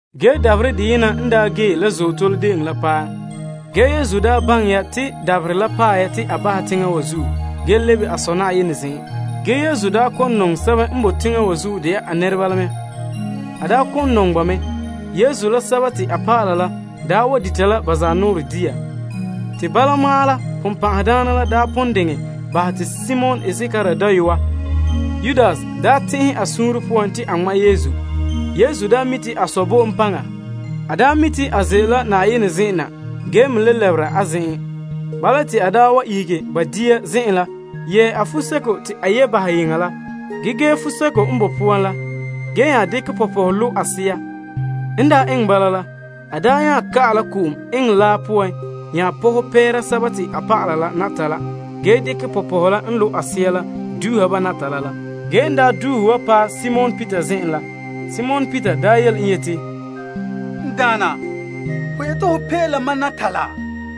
Ge dabaherɛ deyena n daa gee la Azootole De'eŋɔ la paɛ. Ge Yesu baŋɛ ya te dabaherɛ la paɛ ya te a bahɛ teŋa wa zuo ge lebe a Sɔ Na'ayenɛ zen'en. Yesu ba' nɔŋɛ sɛba n boe teŋa wa zuo de'a a nɛreba la mɛ. N nɔŋɛ ba se'em la ka tare makerɛ. Yesu la a dɔlɔba la daa wa dita la ba zanɔɔrɛ dia. Te bala ma'an la, Sagona la daa pon diŋe bahɛ te Simon Iskariot dayɔa Yudas daa tɛn'ɛhe a suunre poan te a ŋma' Yesu. Yesu daa mi' te a Sɔ bo en paŋa. A mi' te a ze'ele la Na'ayenɛ zen'en na ge me le lɛbera a zen'en la. Bala, te a ihege ba dia zen'en la yɛɛ a fuseko te a yɛ' bahɛ yeŋa la ge gee fuseko n boe poan la, ge nya dekɛ pɔpɔhɛ lo' a sea. N eŋɛ bala la, a nya ka'ɛ la ko'om eŋɛ laa poan pɔhɛ pɛɛra a dɔlɔba la natala ge dekɛ pɔpɔhɛ la n lo' a sea la duuha ba natala la. Ge en duuhe wa paɛ Simon Peter zen'en la, Simon Peter yele en yeti, N Daana, ho yeti ho pee la mam natala?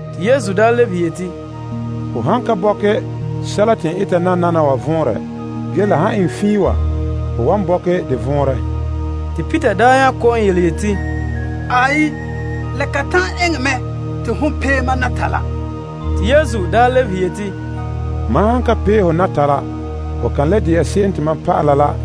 Te Yesu lebehe yeti, Ho nan ka bɔkɛ sɛla te n eta nananawa vɔnrɛ. Ge, la han eŋɛ fiin wa, ho wan bɔkɛ de vɔnrɛ. Te Peter kɔ'ɔn yeti, La kan ta'an eŋɛ mɛ te hon pee mam natala. Te Yesu daa lebehe yeti, Mam han ka pee ho natala, ho kan le de'a mam dɔla.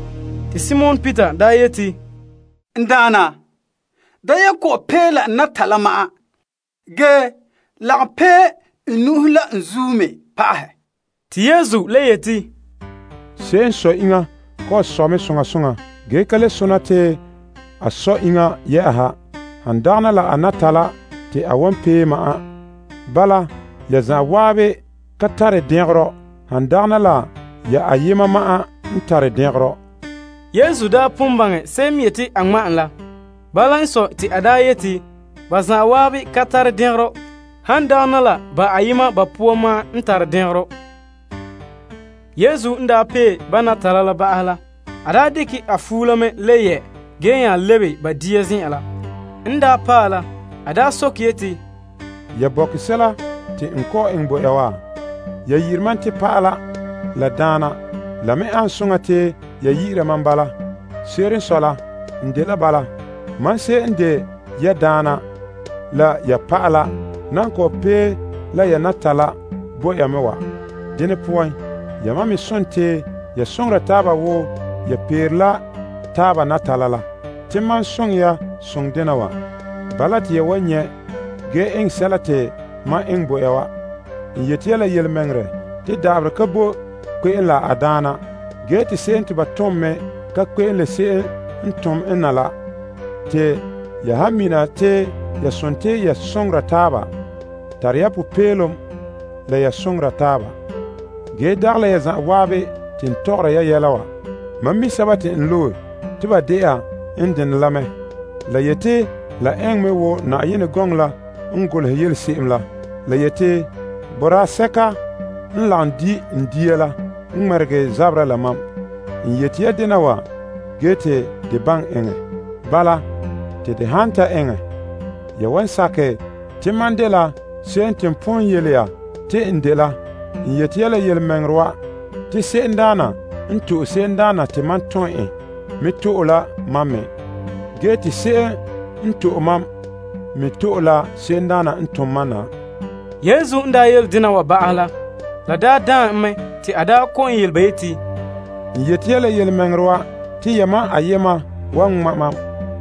Te Simon Peter yeti, N Daana, da ye kɔ'ɔn pee la n natala ma'an. Ge, lagom pee n nu'uhen la n zuo me pa'ahɛ. Te Yesu le yeti, Se'em n sɔ iŋa ko'om sɔ mɛ soŋa soŋa ge ka le sona te a sɔ iŋa, han dagana la a natala te a wan pee ma'an. Bala, ya zan'an ka tare dɛngerɔ, han dagana la ya ayema ma'an n tare dɛngerɔ. Yesu pon baŋɛ se'em n yeti a ŋma' en la. Bala n sɔe, te a yeti ba zan'an ka tare dɛngerɔ, han dagana la ba ayema ba poan ma'an n tare dɛngerɔ. Yesu n daa pee ba natala ba'ahɛ la, a dekɛ a fuo la mɛ le yɛ ge nya lebe ba dia zen'en la. En paɛ la, a sokɛ yeti, Ya bɔkɛ sɛla te n kɔ'ɔn eŋɛ bo ya wa? Ya yi'ire mam te Pa'ala, la Daana. La me ane soŋa te ya yi'ira mam bala. Se'ere n sɔe la, n dela bala. Mam se'em n de ya Daana, la ya pa'ala nan kɔ'ɔn pee la ya natala bo ya mɛ wa. Dene poan, yamam me sontii ya soŋora taaba wo ya peere la taaba natala la. Te mam soŋɛ ya soŋɛ dena wa. Bala, te ya wan nyɛ' ge eŋɛ sɛla te mam eŋɛ bo ya wa. N yeti ya la yelemɛŋɛrɛ, te da'aberɛ ka boe kpe'em la a daana ge te bitonoŋa mɛ ka kpe'em gana se'em n tom en na la. Te ya han mina te ya sontii ya soŋora taaba, tara ya popeelom la ya soŋora taaba. Ge dagɛ la ya zan'an te n tɔgɔra ya yɛla wa. Mam mi' sɛba te n loe te ba de'a n denɛ la mɛ. La yeti la eŋɛ mɛ wo Yenɛ gɔŋɔ la n golehɛ yele se'em la. La yeti, Mam la se'em lagom dita laa kayena poan la, zagahɛ mam mɛ. N yeti ya dena wa ge te de baŋɛ eŋɛ. Bala, te de han ta eŋɛ ya wan sakɛ te mam dela se'em te n pon yele ya te n dela. N yeti ya la yelemɛŋɛrɛ wa, te se'emdaana n to'e se'emdaana te mam tom en, me to'e la mam me. Ge te se'em n to'e mam, me to'e la se'emdaana n tom mam na. Yesu n daa yele dena wa ba'ahɛ la, la daan en mɛ te a kɔ'ɔn yele ba yeti, N yeti ya la yelemɛŋɛrɛ wa. Te yamam ayema wan ŋma' mam.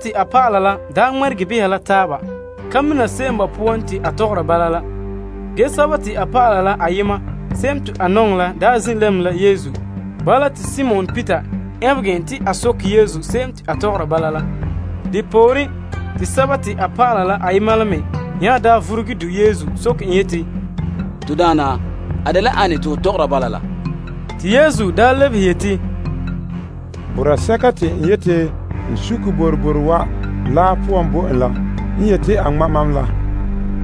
A dɔlɔba la daa ŋmɛregɛ bahɛ la taaba ka mina se'em ba poan te a tɔgɔra bala la. Ge a dɔlɔba se'em te Yesu nɔŋɛ la daa zin' lɛm la en. Bala, te Simon Peter ɛnbɛgɛ en te a soke Yesu se'em te a tɔgɔra bala la. Depooren, te a vuruge du' Yesu soke en yeti, To Daana, a dela ane te ho tɔgɔra bala la? Te Yesu lebehe yeti, Boraa sɛka te n yeti n sukɛ boroboro wa laa poan bo en la n yeti a ŋma' mam la.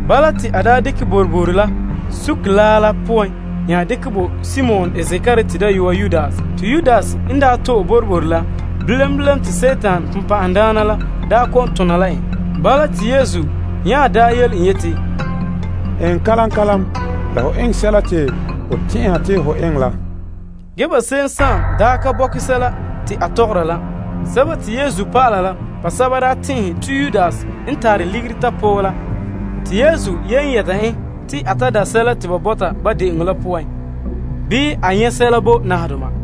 Bala, te a dekɛ boroboro la sukɛ laa la poan nya dekɛ bo Simon Iskariot dayɔa Yudas. Te Yudas n to'e boroboro la, bilam bilam te Dima la kɛn' en. Bala, te Yesu nya yele en yeti, Eŋɛ kalam kalam la ho eŋɛ sɛla te ho tɛn'ɛha te ho eŋɛ la. Ge ba se'em ka bɔkɛ sɛla te a tɔgɔra la. la basɛba daa tɛn'ɛhe te Yudas n tare ligiri tapɔɔ la te Yesu yen yɛta en te a ta da' sɛla te ba bɔta ba de'eŋɔ la poan. Bii, a nyɛ' sɛla bo nahedoma.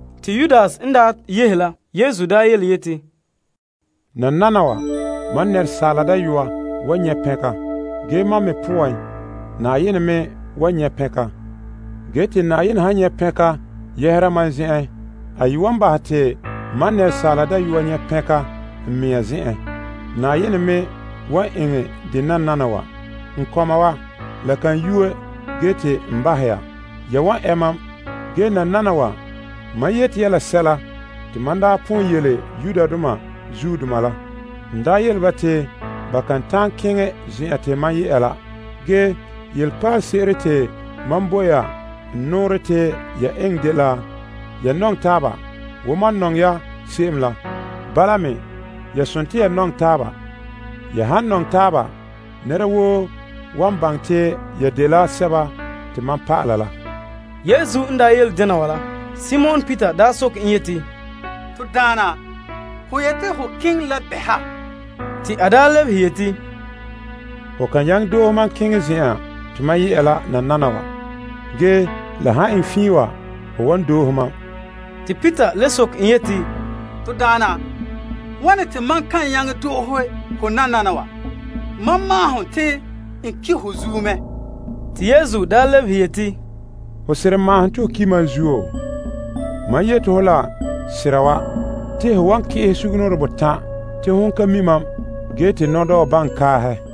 Te Yudas n ta yehe la, Yesu yeti, Nananawa, Asaala Dayɔa wan nyɛ' pɛnka, ge mam me poan Na'ayenɛ me wan nyɛ' pɛnka. Ge, te Na'ayenɛ han nyɛ' pɛnka yɛhera mam zen'en, a ye wan bahɛ te Asaala Dayɔa nyɛ' pɛnka n mea zen'en. Na'ayenɛ me wan eŋɛ dɛ nananawa. N kɔma wa, la kan yue ge te n bahɛ ya. Ya wan ɛ mam, ge nananawa mam yeti ya sɛla te mam daa pon yele Yudoma la. N yele ba te ba kan ta'an keŋɛ zen'an te mam ye'a la. Ge nɔpaalese'ere te mam bo ya te ya nɔŋɛ taaba. Wo mam nɔŋɛ ya se'em la, bala me ya sontii ya nɔŋɛ taaba. Ya han nɔŋɛ taaba, nɛra woo wan baŋɛ te ya dela mam dɔlɔba. Yesu n daa yele dena wa la, Simon Peter soke en yeti, To Daana, ho yeti ho keŋɛ la bɛ ha? Te a lebehe yeti, Ho ka nyaŋɛ doohe mam keŋɛ zen'an te mam ye'a la nananawa. Ge, la han eŋɛ fiin wa, ho wan doohe mam. Te Peter le soke en yeti, To Daana, wane te mam ka nyaŋɛ doohe ho nananawa? Mam maahom te n ki' ho zuo mɛ. Te Yesu lebehe yeti, Hon seren maahom te ho ki' mam zuo? Mam yeti ho la sera wa. Te ho wan ki'ehɛ sugumnɔɔren botan' te hon ka mi' mam ge te nɔdɔɔ baŋɛ kaahɛ.